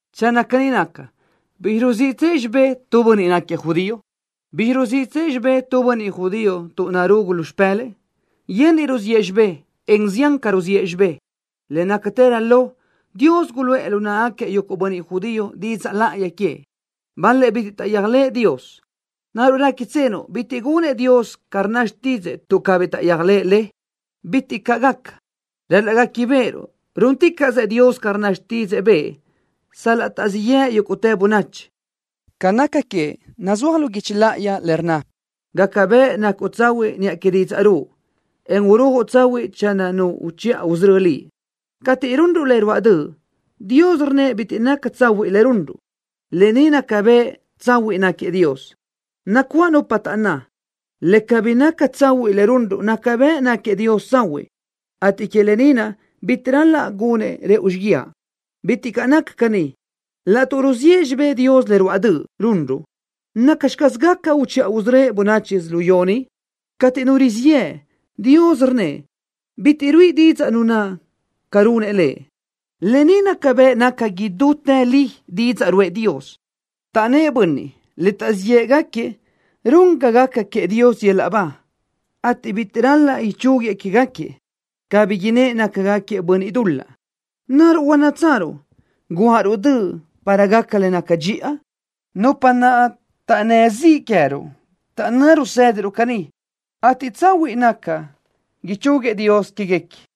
Channö caní naca, ¿bizxi ruziʼtsëʼ xibé tu bönniʼ tuʼ náquiëʼ judío? ¿Bizxi ruziʼë xibé tu bönniʼ judío tuʼ narugu lu xipë́lëʼë? Yenniʼ ruziʼë xibé, en zián ca ruziʼë xibé. Le nácatërö lo, Dios guluʼë lu náʼagaquiëʼ yuguʼ bönniʼ judío didzaʼ láʼayi queëʼ. Bal-lëʼ bitiʼ taʼyéajlëʼë Dios. ¿Naruʼ réquitsenuʼ bitiʼ gunëʼ Dios ca rnna xtídzëʼë tuʼ cabí taʼyéajlëʼë Lëʼ? ¡Bitiʼ caʼ gaca! Ral-laʼ guéquibeʼeruʼ rúnticaʼsëʼ Dios ca rnna didzaʼ bëʼë, sal-laʼ taʼzíʼ yëʼ yúguʼtë bönachi. Ca naca queëʼ nazúaj lu guichi láʼayi le rnna: Gaca bëʼ nacuʼ tsahuiʼ niʼa que didzaʼ ruʼu, en urujuʼ tsahuiʼ channö nu uchiʼa usörö́ Liʼ. Cateʼ runruʼ le ruáʼ döʼ, Dios rnnëʼ bitiʼ naca tsahuiʼ le runruʼ. Lë ni naca bëʼ tsahuiʼ náquiëʼ Dios. Nacuáʼ nupa taʼnná: “Le cabí naca tsahuiʼ le runruʼ naca bëʼ náquiëʼ Dios tsahuiʼ, ateʼ que lë ni naʼ bitiʼ ral-laʼ gunëʼ rëʼu xíguiaʼ.” ¡Bitiʼ caʼ naca caní! Laʼtuʼ ruziʼë xibé Dios le ruáʼ döʼ runruʼ, ¿nacxi caz gaca uchiʼa usörö́ëʼ bönachi yödzölió ni? Cateʼ nu rizíʼ yëʼ, Dios rnnëʼ bitiʼ ruíʼi didzaʼ nu naʼ ca runëʼ Lëʼ. Lë ni naca bëʼ naca idútë li didzaʼ ruʼë Dios. Taʼnnë́ʼ bönniʼ le taʼzíʼ yëʼë légaquiëʼ run ga gaca queëʼ Dios yöl-laʼ ba, ateʼ bitiʼ ral-laʼ ichúguiëʼ quégaquiëʼ, cabí innë́ʼ nácagaquiëʼ bönniʼ dul-laʼ. ¿Naruʼ huannátsaruʼ: “Guáʼaruʼ döʼ para gaca le naca dxiʼa”? Nupa naʼ taʼnnë́ ziʼ queë́ruʼ taʼnná rusédiruʼ caní, ateʼ tsahuiʼ naca ichúguiëʼ Dios quéguequi.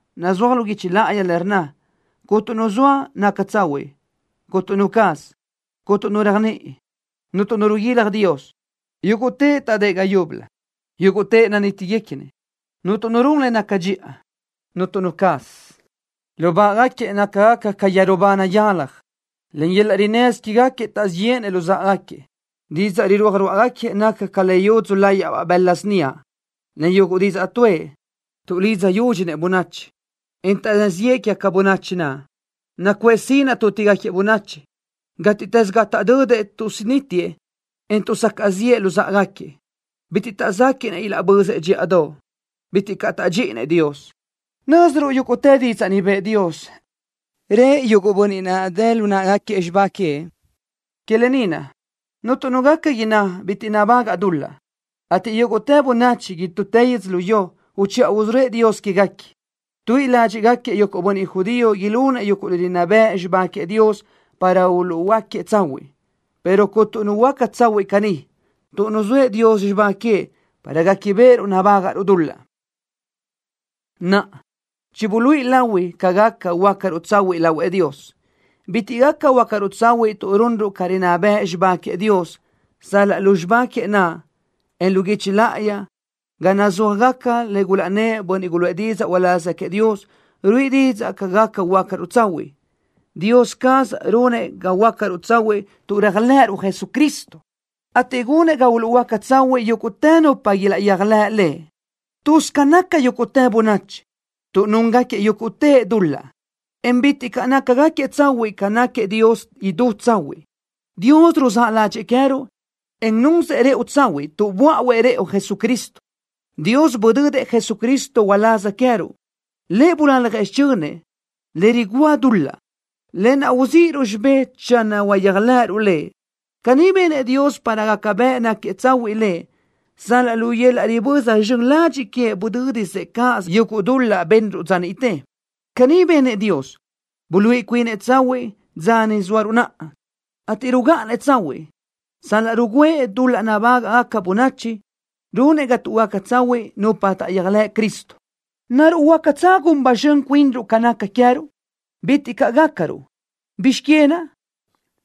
Nazúaj lu guichi láʼayi le rnna: Cuntu nu zoa naca tsahuiʼ, cuntu nu caz. Cuntu nu réajniʼi. Cuntu nu riguilaj Dios. Yúguʼtëʼ taʼdë́ʼ ga yúbölö. Yúguʼtëʼ nanítigaquiëʼ. Cuntu nu run le naca dxiʼa, cuntu nu caz. Lubáʼagaquiëʼ nácagaca ca yeru ba nayáljagaca. Len yöl-laʼ rinnësö quégaquiëʼ taʼzíʼ yéʼenëʼ luzáʼagaquiëʼ. Didzaʼ rirúaj ruáʼagaquiëʼ naca ca le yudzu láyaʼbaʼ bëla síniaʼ. Len yuguʼ didzaʼ tuʼë, tuʼdidzaʼ yúdxinëʼ bönachi, en taʼnnë́ ziʼë quégaca bönachi naʼ. Nacuʼë sinaʼ tútigaquiëʼ bönachi. Gátiʼtës ga taʼdödëʼ tuʼsunítiëʼ, en tuʼsacaʼ ziʼë luzáʼagaquiëʼ. Bitiʼ taʼzéquiʼnëʼ ilaʼbözëʼ dxíʼadoʼ. Bitiʼ caʼ tádxinëʼ Dios. Nö́ziruʼ yúguʼtë didzaʼ ni bëʼë Dios, rëʼ yuguʼ bönniʼ naʼ dë lu náʼagaquiëʼ xibá queëʼ. Que lë ni naʼ cuntu nu gaca inná bitiʼ nabagaʼ dul-laʼ, ateʼ yúguʼtë bönachi idútë yödzölió, uchiʼa usörö́ëʼ Dios quéguequi. Tuíʼi ládxiʼgaquiëʼ yuguʼ bönniʼ judío ilunëʼ yuguʼ le rinná bëʼ xibá queëʼ Dios para uluʼhuöáquiëʼ tsahuiʼ, pero cuntu nu huöáca tsahuiʼ caní, tuʼ nuzóëʼ Dios xibá queëʼ para guéquibeʼeruʼ nabágaʼruʼ dul-laʼ. Naʼa, chibuluíʼi lahui ca gaca huöácaruʼ tsahuiʼ lahuëʼ Dios. Bitiʼ gaca huöácaruʼ tsahuiʼ tuʼ runruʼ ca rinná bëʼ xibá queëʼ Dios, sal-laʼ lu xibá queëʼ naʼ, en lu guichi láʼayi ga nazúajgaca le gulaʼnnë́ʼ bönniʼ guluʼë didzaʼ uláz queëʼ Dios, ruíʼi didzaʼ ca gaca huöácaruʼ tsahuiʼ. Dios caz runëʼ ga huöácaruʼ tsahuiʼ tuʼ réajlëʼëruʼ Jesucristo, ateʼ gunëʼ ga uluʼhuöáca tsahuiʼ yúguʼtë nupa ilaʼyéajlëʼ Lëʼ. Tuz ca nácagaca yúguʼtë bönachi tuʼ núngaquiëʼ yúguʼtëʼ dul-laʼ, en bitiʼ caʼ nácagaquiëʼ tsahuiʼ ca naʼ náquiëʼ Dios idú tsahuiʼ. Dios ruzáʼ ládxëʼë queë́ruʼ, en nunsëʼ rëʼu tsahuiʼ tuʼ böáʼuëʼ Jesucristo rëʼu. Dios budödëʼ Jesucristo uláz queë́ruʼ. Lëʼ bulaljëʼ xichönëʼ, le rigúa dul-laʼ, lë naʼ uzíʼiruʼ xibé channö uyéajlëʼëruʼ Lëʼ. Caní benëʼ Dios para gaca bëʼ náquiëʼ tsahuiʼ Lëʼ sal-laʼ lu yöl-laʼ riböza zxön ladxiʼ queëʼ budö́disëʼ cáʼasö yuguʼ dul-laʼ benruʼ dza niʼte. Caní benëʼ Dios, buluíʼi cuinëʼ tsahuiʼ dza ni zóaruʼ naʼa, ateʼ rugáʼanëʼ tsahuiʼ sal-laʼ rugǘëʼ dul-laʼ nabágaʼgaca bönachi, runëʼ ga tuʼhuöáca tsahuiʼ nupa taʼyéajlëʼ Cristo. ¿Naruʼ huácatsö gun ba zxön cuinruʼ ca naca queë́ruʼ? ¡Bitiʼ caʼ gácaruʼ! ¿Bizx que naʼ?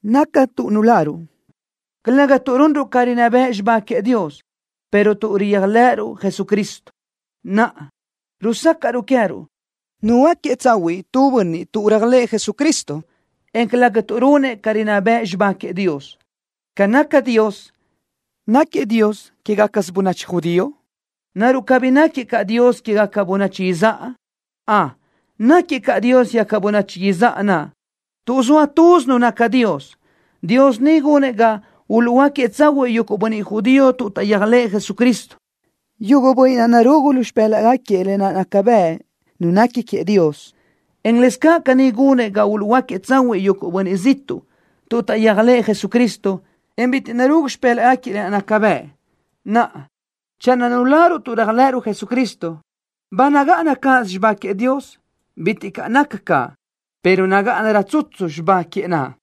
Naca tuʼ nuláruʼ, calëga tuʼ runruʼ ca rinná bëʼ xibá queëʼ Dios, pero tuʼ réajlëʼësiruʼ Jesucristo. Naʼa, rusácaʼruʼ queë́ruʼ nuhuöáquiëʼ tsahuiʼ tu bönniʼ tuʼ réajlëʼë Jesucristo, en calëga tuʼ runëʼ ca rinná bëʼ xibá queëʼ Dios. Ca naca Dios, ¿náquiëʼ Dios quégacasö bönachi judío? ¿Naruʼ cabí náquiëʼ caʼ Dios quégaca bönachi izáʼa? Ön, náquiëʼ caʼ Dios quégaca bönachi izáʼa naʼ tuʼ zoa Tuz Nu naca Dios. Dios ni gunëʼ ga uluʼhuöáquiëʼ tsahuiʼ yuguʼ bönniʼ judío tuʼ taʼyéajlëʼë Jesucristo, yuguʼ bönniʼ naʼ narugu lu xipë́laʼgaquiëʼ lë naʼ naca bëʼ nu nequi queëʼ Dios, en lëscaʼ caní gunëʼ ga uluʼhuöáquiëʼ tsahuiʼ yuguʼ bönniʼ ziʼtuʼ tuʼ taʼyéajlëʼë Jesucristo, en bitiʼ narugu lu xipë́laʼgaquiëʼ lë naʼ naca bëʼ. Naʼa, channö nuláruʼ tuʼ réajlëʼësiruʼ Jesucristo, ¿ba nagáʼana cáʼasö xibá queëʼ Dios? ¡Bitiʼ caʼ naca caʼ, pero nagáʼanarö tsutsu xibá queëʼ naʼ!